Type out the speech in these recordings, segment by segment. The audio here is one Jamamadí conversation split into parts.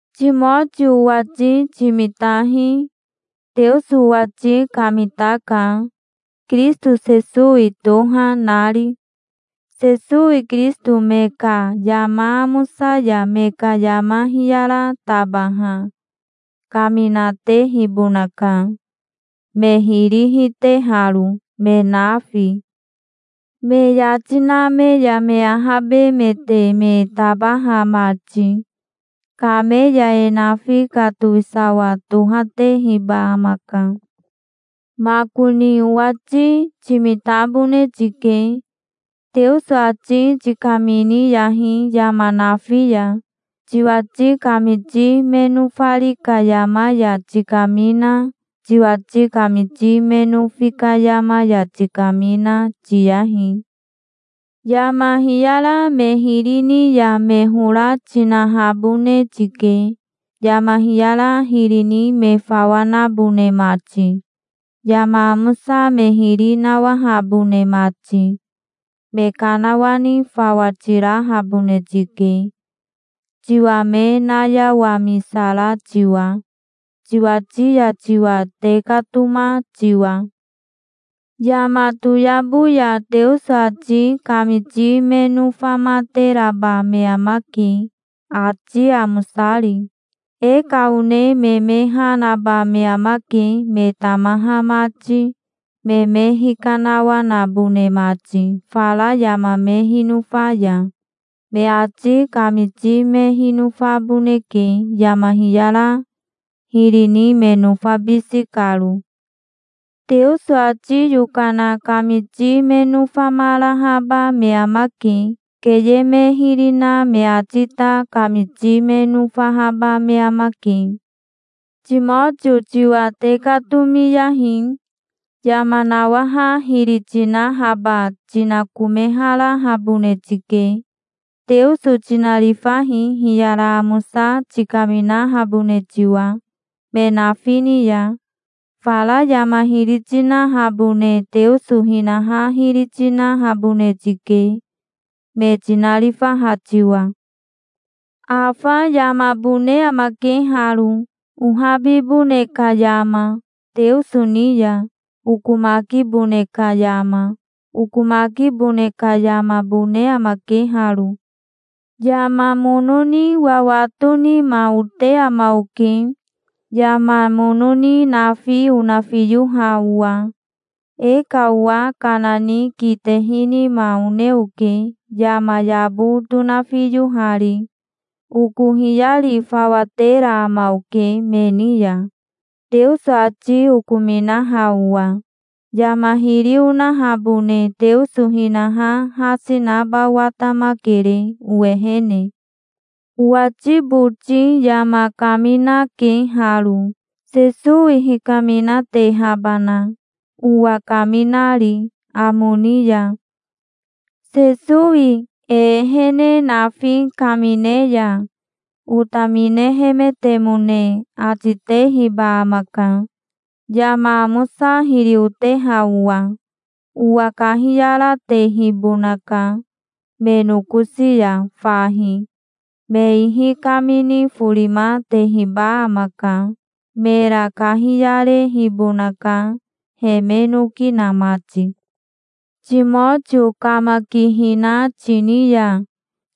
Timotio owati timitahi. Teoso owati kamitaka, Kirisito Sesowi toha, nari. Sesowi Kirisito me ka yama amosa ya me ka yama hiyara tabaha kaminatehibonaka, me hiri hiteharo, me nafi, me yati na me ya me ahabemete me tabaha mati. Kame ya e nafi ka towisawa tohatehiba amaka. Makoni owati timitabone tike. Teoso ati tikaminiyahi yama nafi ya. Tiwati kamiti me nofari ka yama ya tikamina, tiwati kamiti me nofi ka yama ya tikamina, tiyahi. Yama hiyara me hiri ni ya me hora tinahabone tike, yama hiyara hiri ni me fawa nabone mati, yama amosa me hiri nawahabone mati. Me kanawani fawa tirahabone tike, tiwa me nayawamisara tiwa, tiwati ya tiwa tekatoma tiwa. Yama toyabo ya Teoso ati kamiti me nofamateraba me amake, ati amosari. E ka one me me ha naba me amake, me tamaha mati, me me hikanawanabone mati fara yama me hinofa ya. Me ati kamiti me hinofaboneke, yama hiyara hiri ni me nofabisi karo. Teoso ati yokana kamiti me nofamarahaba me amake. Keye me hiri na me ati ta kamiti me nofahaba me amake. Timotio tiwa tekatomiyahi. Yama nawaha hiri tinahaba tinakomeharahabone tike. Teoso tinarifahi, hiyara amosa tikaminahabone tiwa, me nafi ni ya. Fara yama hiri tinahabone Teoso hinaha hiri tinahabone tike, me tinarifaha tiwa. Afa yamabone amake haro, ohabibone ka yama Teoso ni ya, okomakibone ka yama. Okomakibone ka yamabone amake haro. Yama mono ni wawato nima ote ama oke, yama mono ni nafi onafiyoha owa. E ka owa kana ni kitehi nima one oke, yama yabo tonafiyohari. Oko hiyari fawa tera ama oke me ni ya, Teoso ati okominaha owa. Yama hiri onahabone Teoso hinaha hasi naba watamakere owehene. Owati boti yama kaminake haro, Sesowi hikaminatehabana, owa kaminari amo ni ya. Sesowi e ehene nafi kamine ya otaminehemetemone ati tehiba amaka, yama amosa hiri oteha owa. Owa kahiyaratehibonaka me nokosi ya fahi. Me ihi kamini forima tehiba amaka. Mera kahiyarehibonaka, he me noki na mati. Timotio kamakihina tini ya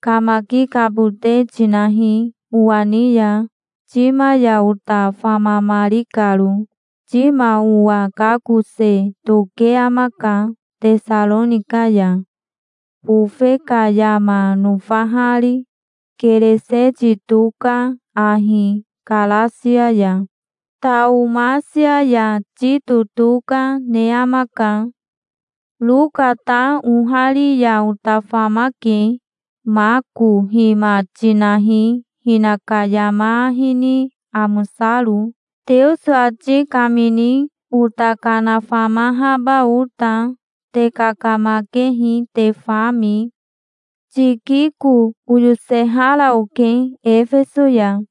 kamakikabote tinahi owa ni ya, Tima ya ota famamari karo. Tima owa kakose toke amaka Tesaronika ya, bofe ka yama nofahari. Kereseti toka, ahi Karasia ya. Taomasia ya Tito toka, ne amaka. Roka ta ohari ya ota famake. Mako hima tinahi, hinaka yama ahi ni amosaro, Teoso ati kamini ota kanafamahaba ota. Te kakamakehi te fami. Tikiko oyosehara oke Efeso ya.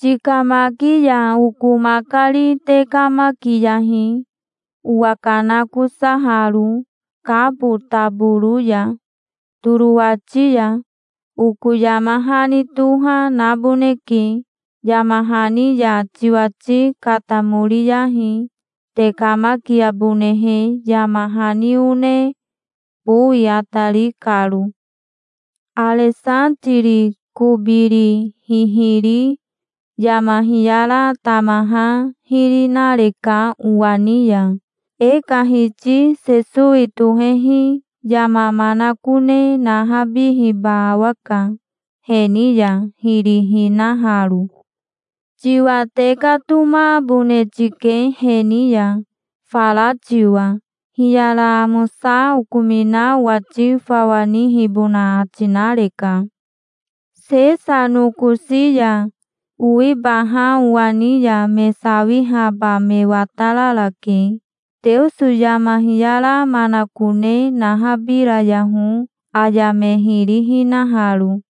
Tikamaki ya oko makari tekamakiyahi, owakanakosaharo Kabo taboro ya, Torowati ya. Oko yama hani toha, naboneke. Yama hani ya tiwati katamoriyahi, tekamakiabonehe, yama hani one, bowi atari karo. Aresatiri kobiri hihiri yama hiyara tamaha hiri nareka owa ni ya. E ka Hiti Sesowi tohehi yama manakone nahabihiba awaka, he ni ya hiri hinaharo. Tiwa tekatomabone tike he ni ya, fara tiwa. Hiyara amosa okomina owati fawa nihibona ati nareka. Sesa nokosi ya owibaha owa ni ya me sawihaba me watararake. Teoso yama hiyara manakone nahabirayaho aya me hiri hinaharo.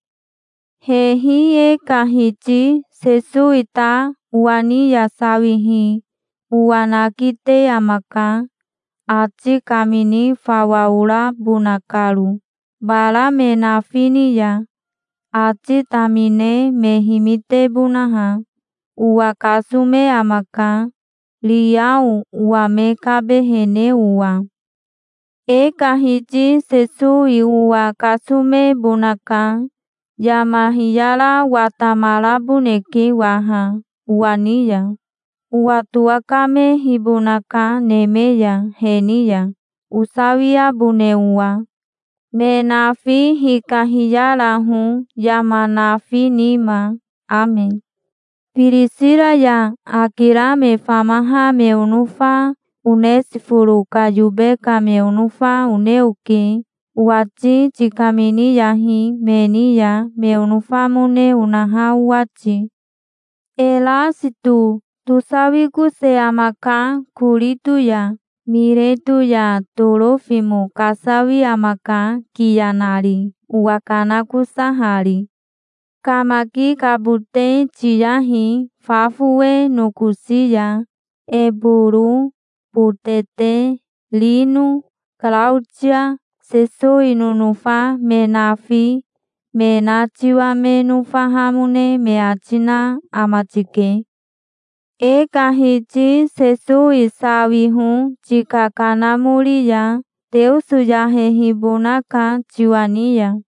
Hehi e ka Hiti Sesowi ta owa ni ya sawihi owa nakite amaka, ati kamini fawa orabona karo, bara me nafi ni ya, ati tamine me himitebonaha. Owa kasome amaka, riao owa me kabehene owa. E ka Hiti Sesowi owa kasomebonaka. Yama hiyara watamaraboneke waha owa ni ya. Owa towakamehibonaka neme ya he ni ya osawiabone owa. Me nafi hikahiyaraho yama nafi nima. Ame. Birisira ya Akira me famaha me onofa, Onesiforo ka yobe ka me onofa, one oke. Owati tikaminiyahi me ni ya, me onofamone onaha owati. Erasito tosawikose amaka, Korito ya. Mireto ya Torofimo kasawi amaka, kiya nari, owakanakosahari. Kamakikabote tiyahi fa fowe nokosi ya. Eboro, Botete, Rino, Karaotia, Sesowi nonofa me nafi, me na tiwa me nofahamone me ati na ama tike. E ka Hiti Sesowi sawiho tika kanamori ya. Teoso yahehibonaka tiwa ni ya.